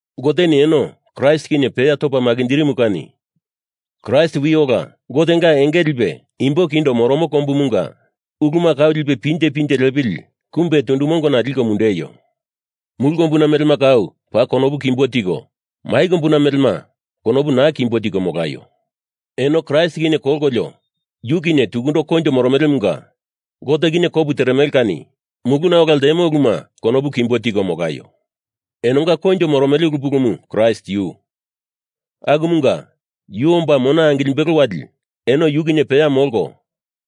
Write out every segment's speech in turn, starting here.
Goteni eno Kraist kinye peya topa makinjirimu kani Kraist wi ola Gotenga enge lipe imbo kindo moromo kombumunga uluma kau lipe pinje pinje lepili kumbe tundu mongona liko mundeio. Mulu kombuna melema kau paa konopu kimbo tiko, mai kombuna melema konopu naa kimbo tiko molaio. Eno Kraist kinye kolkolio yu kinye tukundo koinjo moromelemunga Gote kinye kopu teremele kani muluna ola ltemo uluma konopu kimbo tiko molaio. Enonga koinjo moromele ulu pulumu Kraist yu. Akumunga yu omba mona angilimbelo wali eno yu kinye peya molko,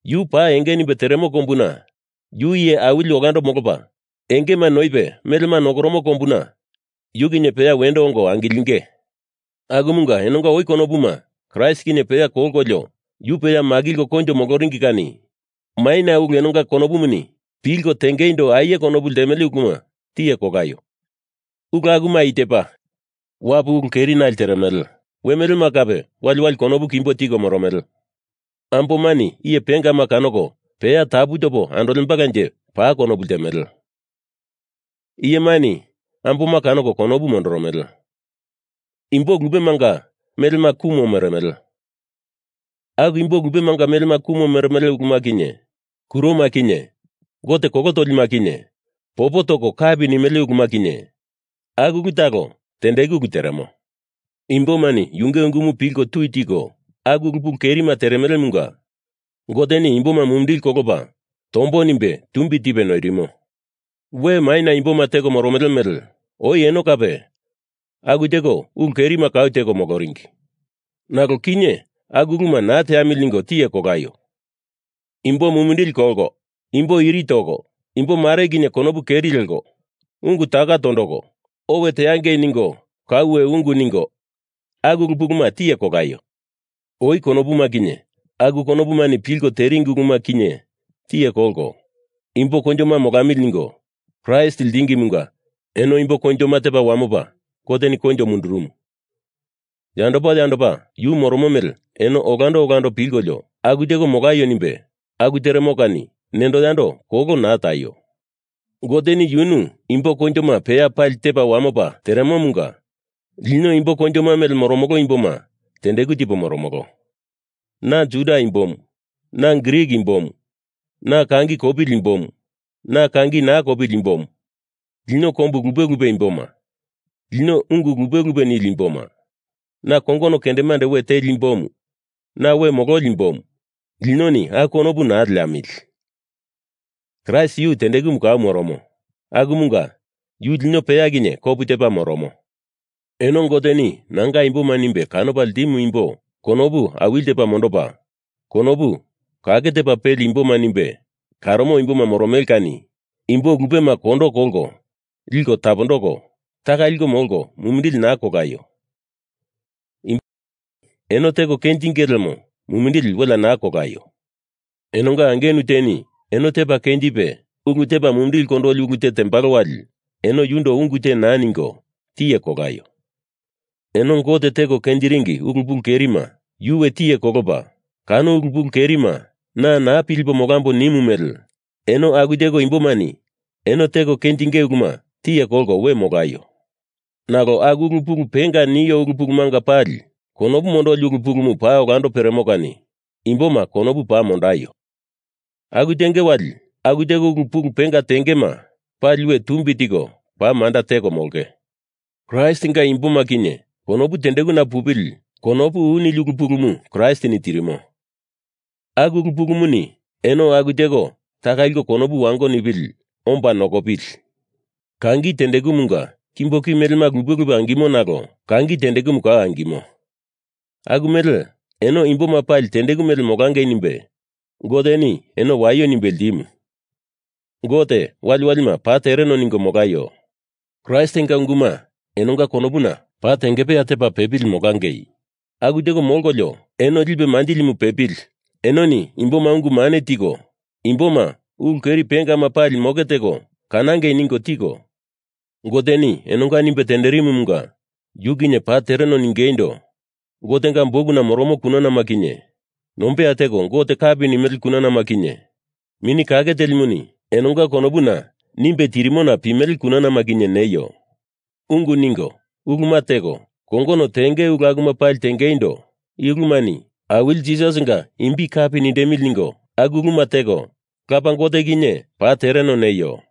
yu pa enge nimbe teremo kombuna yu iye awili olando molopa engema noipe melema nokoromo kombuna yu kinye peya wendo ongo angilinge. Akumunga enonga oi konopuma Kraist kinye peya kolkolio yu peya makilko koinjo moloringi kani maina ulu enonga konopumani pilkolio tengeindo aie konopu ltemele uluma tiye kolaio! Ulu akuma i tepa: Wapu ulu kerinali teremele. We melema kape wali wali konopu kimbo tiko moromele. Ambomani iye pengama kanoko peya tapu topo andolembalanje paa konopu ltemele. Iyemani amboma kanoko konopu mondoromele. Imbo lupemanga melema kumo meremele. Aku imbo lupemanga melema kumo meremele uluma kinye, kuroma kinye gote kolo tolima kinye popo toko kapi nimele uluma kinye, aku ulu talo tendeku ulu teremo. Imbomani yunge ungumu pilko tui tiko aku ulu pulu kerima teremelemunga Goteni imboma mumindili kolopa tombo nimbe tumbi tipe noirimo. We maina imboma teko moromele mele oi eno kape aku teko ulu kerima kau teko moloringi. Nalo kinye aku uluma naa teamili ningo tiye kolaio. Imbo mumindili kolko, imbo iri toko, imbomare kinye konopu keri leko, ungu tako tondoko, owe teangei ningo kauwe ungu ningo, aku ulu puluma tiye kolaio. Oi konopuma kinye aku konopumani pilko teringi uluma kinye tiye kolko, imbo koinjoma molamili ningo Kraist ltingimunga eno imbo koinjoma tepa wamopa Goteni koinjo mundurumu, yandopa yandopa yu moromo mele eno olando olando pilkolio aku teko molaio nimbe aku teremo kani nendo yando kolo naa taio. Goteni yunu imbo koinjoma peya pali tepa wamopa teremomunga lino imbo koinjoma mele moromolo imboma tendeku tipo moromolo. Na Juda imbomu, na Grik imbomu. Na kangi kopili imbomu, na kangi naa kopili imbomu. Lino kombu lupe lupe imboma, lino ungu lupe lupe nili imboma. Na kongono kendemande we teli imbomu, na we mololi imbomu. Linoni aku konopu naa leamili. Kraist yu tendekumu kau moromo. Akumunga yu lino peya kinye kopu tepa moromo. Eno Goteni nanga imboma nimbe kanopa ltimu imbo konopu awili tepa mondopa, konopu kake tepa peli imboma nimbe karomo imboma moromele kani imbo lupema kondo kolko liko tapondoko, taka liko molko mumindili naa kolaio. Imbomareni eno teko kenjinge lemo mumindili welea naa kolaio. Enonga angenu teni eno tepa kenjipe ulu tepa mumindili kondoli ulu te tembalo wali eno yundo ungu te naa ningo, tiye kolaio. Eno Gote teko kenjiringi ulu pulu kerima yu we tiye kolopa kano ulu pulu kerima na naa pilipo molambo nimu mele eno aku teko imbomani eno teko kenjinge uluma tiye kolko we molaio. Nalo aku ulu pulu penga nio ulu pulumanga pali konopu mondoli ulu pulumu paa olando peremo kani imboma konopu paa mondaio. Aku tenge wali aku teko ulu pulu penga tengema pali we tumbi tiko paa manda teko molonge. Kraistinga imboma kinye konopu tendekuna pupili konopu u nili ulu pulumu Kraistini tirimo aku ulu pulumuni eno aku teko taka liko konopu wango nipili molaio nimbe omba nokopili. Kangi tendekumunga kimbo ki melema lupe lupe angimo nalo kangi tendekumu kau angimo aku mele eno imboma pali tendeku mele molangei nimbe Goteni eno waio nimbe ltimu. Gote waliwalima paa tereno ningo molaio. Kraistinga unguma enonga konopuna paa tengepeya tepa pepili molangei aku teko molkolio eno lipe manjilimu pepili enoni imboma ungu mane tiko, imboma ulu keri pengama pali moke teko kanangei ningo tiko, Goteni enonga nimbe tenderemomunga yu kinye paa tereno ningeindo Gotenga bukuna moromo kunanama kinye, nombeya teko Gote kapi nimele kunanama kinye, Mini Kake Telimuni enonga konopuna nimbe tirimona pimele kunanama kinye, neio. Ungu ningo uluma teko kongono tenge ulu akuma pali tengeindo i ulumani Awili Jisasinga imbi kapi nindemili ningo aku uluma teko, Lapa Gote kinye paa tereno neio.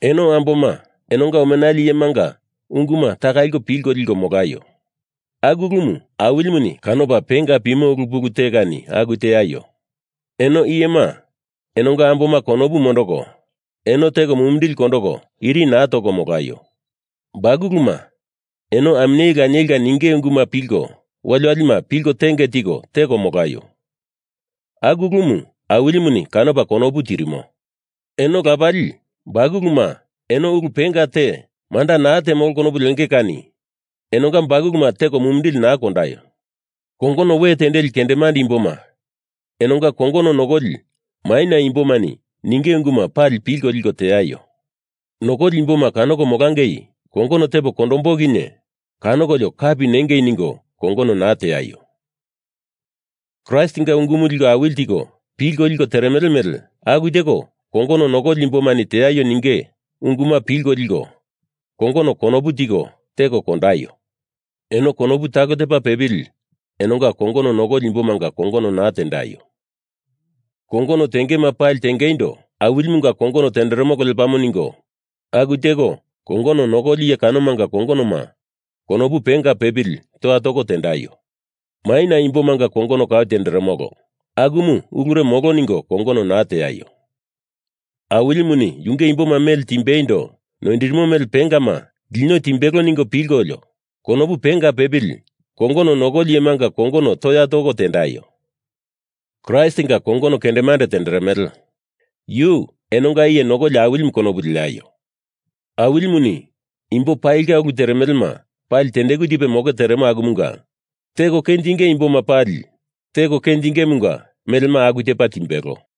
Eno amboma, enonga omenali iyemanga unguma taka liko pilko liko molaio. Aku ulumu Awilimuni kanopa penga pimo ulu pulu te kani aku teaio. Eno iyema, enonga amboma konopu mondoko eno teko mumindili kondoko iri naa toko molaio. Bakuluma, eno aminyeli lanielini ninge unguma pali waliwalima pilko tenge tiko teko molaio. Aku ulumu Awilimuni kanopa konopu tirimo. Eno lapali, bakuluma eno ulu penga te manda naa temolo konopu lenge kani enonga bakuluma teko mumindili naa kondaio. Kongono we tendeli kendemande imboma, enonga kongono nokoli maina imbomani ninge unguma pali pilko liko teaio. Nokoli imboma kanoko molangei kongono tepo kondombo kinye kanokolio kapi nengei ningo kongono naa teaio. Kraistinga ungumu liko awili tiko pilko liko teremele mele aku teko kongono nokoli imbomani teaio ninge unguma pilko liko kongono konopu tiko teko kondaio. Eno konopu talo tepa pepili enonga kongono nokoli imbomanga kongono naa tendaio. Kongono tengema pali tengeindo Awilimunga kongono tenderemolo lepamo ningo aku teko kongono nokoli iye kanomanga kongonoma konopu penga pepili toya toko tendaio. Maina imbomanga kongono kau tenderemolo, akumu ulure molo ningo kongono naa teaio. Awilimuni yunge imboma mele timbeindo noindirimo mele pengama lino timbelo ningo pilkolio konopu penga pepili kongono nokoli iyemanga kongono toya toko tendaio. Kraistinga kongono kendemande tenderemele. Yu enonga Iye Nokoli Awilimu konopu leaio. Awilimuni imbo palinga ulu teremelema pali tendeku tipe moke teremo akumunga teko kenjinge imboma pali teko kenjingemunga melema aku tepa timbelo.